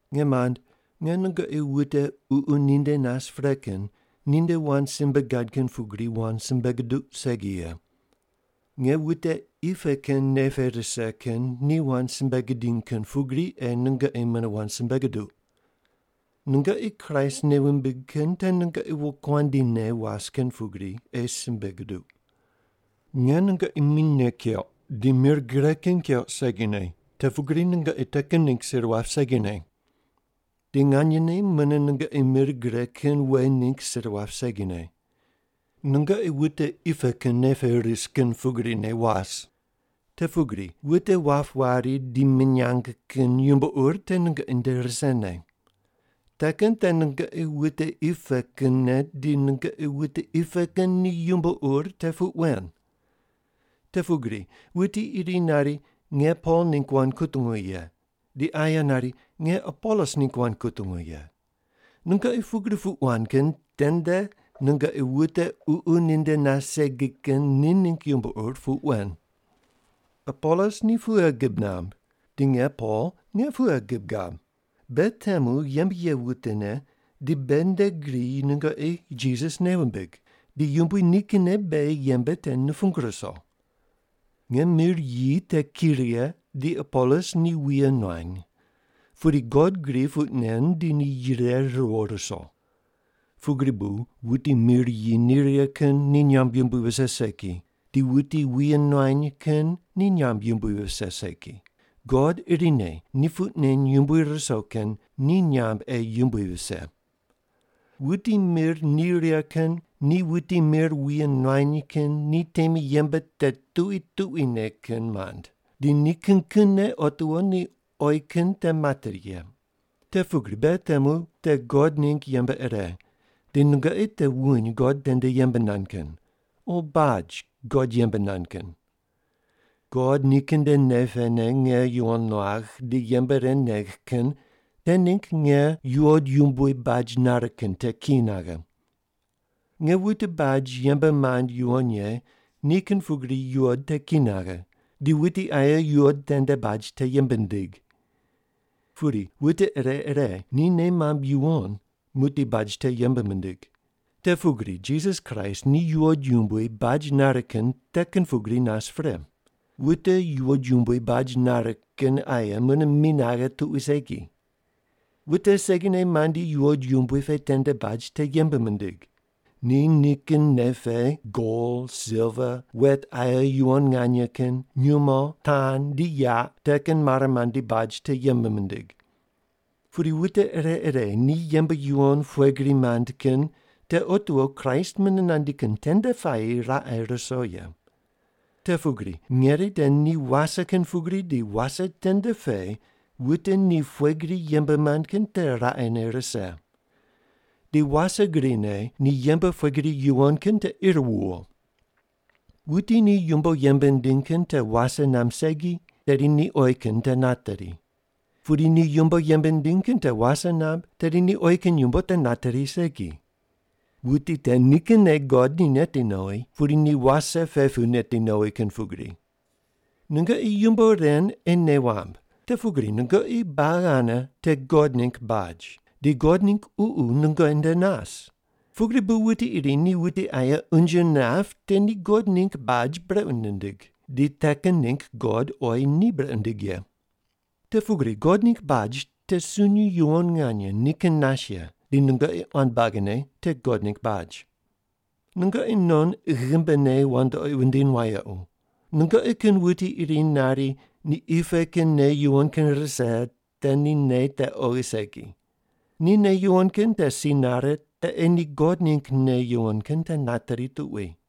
Nge mand, nge nungoqi wute Ququ ninde nas pre kin ninde wand simbe gad kin pugri wand simbe guduq segi ye. Nge wute qi pe kin nei pe ris kin ni wand simbe gidiny kin pugri ei nungoqi mune wand simbe guduq. Nungoqi Kraist nei wumbig kin te nungoqi wokuandi ne was kin pugri ei simbe guduq. Nge nungoqi minyne keuq di mir gre kin keuq segine, te pugri nungoqi te kin ningg sir wap segine. Di nganyene mune nungoqi mir gre kin we ningg sir wap segine. Nungoqi wute qi pe kin nei pe ris kin pugrine was. Te pugri wute wap wari di minyang kin yumbo ur te nungoqi nde risene. Te kin te nungoqi wute qi pe kinne, di nungoqi wute qi pe kin ni yumbo ur te puq wen. Te pugri wuti iri nari, “Nge Pol ningg wand kutungu ye,” di aye nari, “Nge Apolos ningg wand kutungu ye.” Nungoqi pugri puq wand kin tende nungoqi wute Ququ ninde nas segi kin ni ningg yumbo ur puq wen. Apolos ni pughe gib namb di nge Pol nge pughe gib gab? Beghi temu yembe ye wutene di beghi nde gri nungoqi Jisas nei wumbig, di Yumbui nikinne beghi yembe te nupung ruso. Nge mir yi te ki righe di Apolos ni wuye nuany, pudi God gri puq nen di ni yire riwo ruso. Pugri bu wuti mir yi ni righe kin ni nyamb yumbui vise segi, di wuti wuye nuany kin ni nyamb yumbui vise segi, God irine ni puq neny yumbui ruso kin ni nyamb ei yumbui vise. Wuti mir ni righe kin di wuti mir wuye nuany kin ni temi yembe te tuqui tuquine kin mand di ni kin kinne otiwo ni oyi kin te materi ye. Te pugri beghi temu te God ningg yembe ire di nungoqi te wuny God tende yembe nand kin, o baj God yembe nand kin. God nikin nde nei pene nge yuwon nuagh di yembe ren negh kin te ningg nge yuwod yumbui baj nare kin te ki naghe. Nge wute baj yembe mand yuwon ye ni kin pugri yuwod te ki naghe, di wuti aye yuwod tende baj te yembe nindig. Pudi wute ire ire ni nei mamb yuwon muqdi baj te yembe mindig. Te pugri Jisas Kraist ni yuwod yumbui baj nare kin te kin pugri nas pre. Wute yuwod yumbui baj nare kin aye mune mi naghe tuqui segi. Wute segine mandi yuwod yumbui pe tende baj te yembe mindig. Ni nikin nei pe gol, silva, wet aye yuwon nganye kin, nyumo, tan di yaq te kin mare mandi baj te yembe mindig. Pudi wute ire ire ni yembe yuwon pughe gri mand kin te otiwo Kraist mune nandi kin tende puayi raqe ruso ye. Te pugri ngeri te ni wase kin pugri di wase tende pe wute ni pughe gri yembe mand kin te raqene rise. Di wase grine ni yembe pughe gri yuwon kin te ir wuwo. Wuti ni yumbo yembe nindiny kin te wase namb segi, tedi ni oyi kin te nateri. Pudi ni yumbo yembe nindiny kin te wase namb, tedi ni oyi kin yumbo te nateri segi. Wuti te nikinne God ni neti nowi, pudi ni wase pe pu meti nowi kin pugri. Nungoqi yumbo ren ei nei wamb, te pugri nungoqi buagi ane te God ningg baj, di God ningg Ququ nungoqi nde nas. Pugri bu wuti iri ni wute aye unje nap te ni God ningg baj brequ nindig, di te kin ningg God oyi ni brequ nindig ye. Te pugri God ningg baj te sunyi yuwon nganye nikin nas ye, di nungoqi quan buagine te God ningg baj. Nungoqi non ghimbine wandoqi wundiny wayequ. Nungoqi kin wuti iri nari ni qi pe kin nei yuwon kin rise te ni nei te oghi segi. Ni nei yuwon kin te si nare te ei ni God ningg nei yuwon kin te nateri tuqui.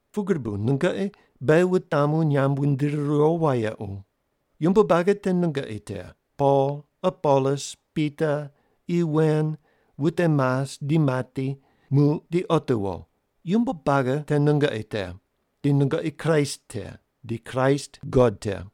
Pugri bu nungoqi beghi wutamu nyamb wundiri riwo wayequ. Yumbo buagi te nungoqi te, Pol, Apolos, Pita, qi wen, wute mas di mati, muq di otiwo, yumbo buagi te nungoqi te. Di nungoqi Kraist te, di Kraist God te.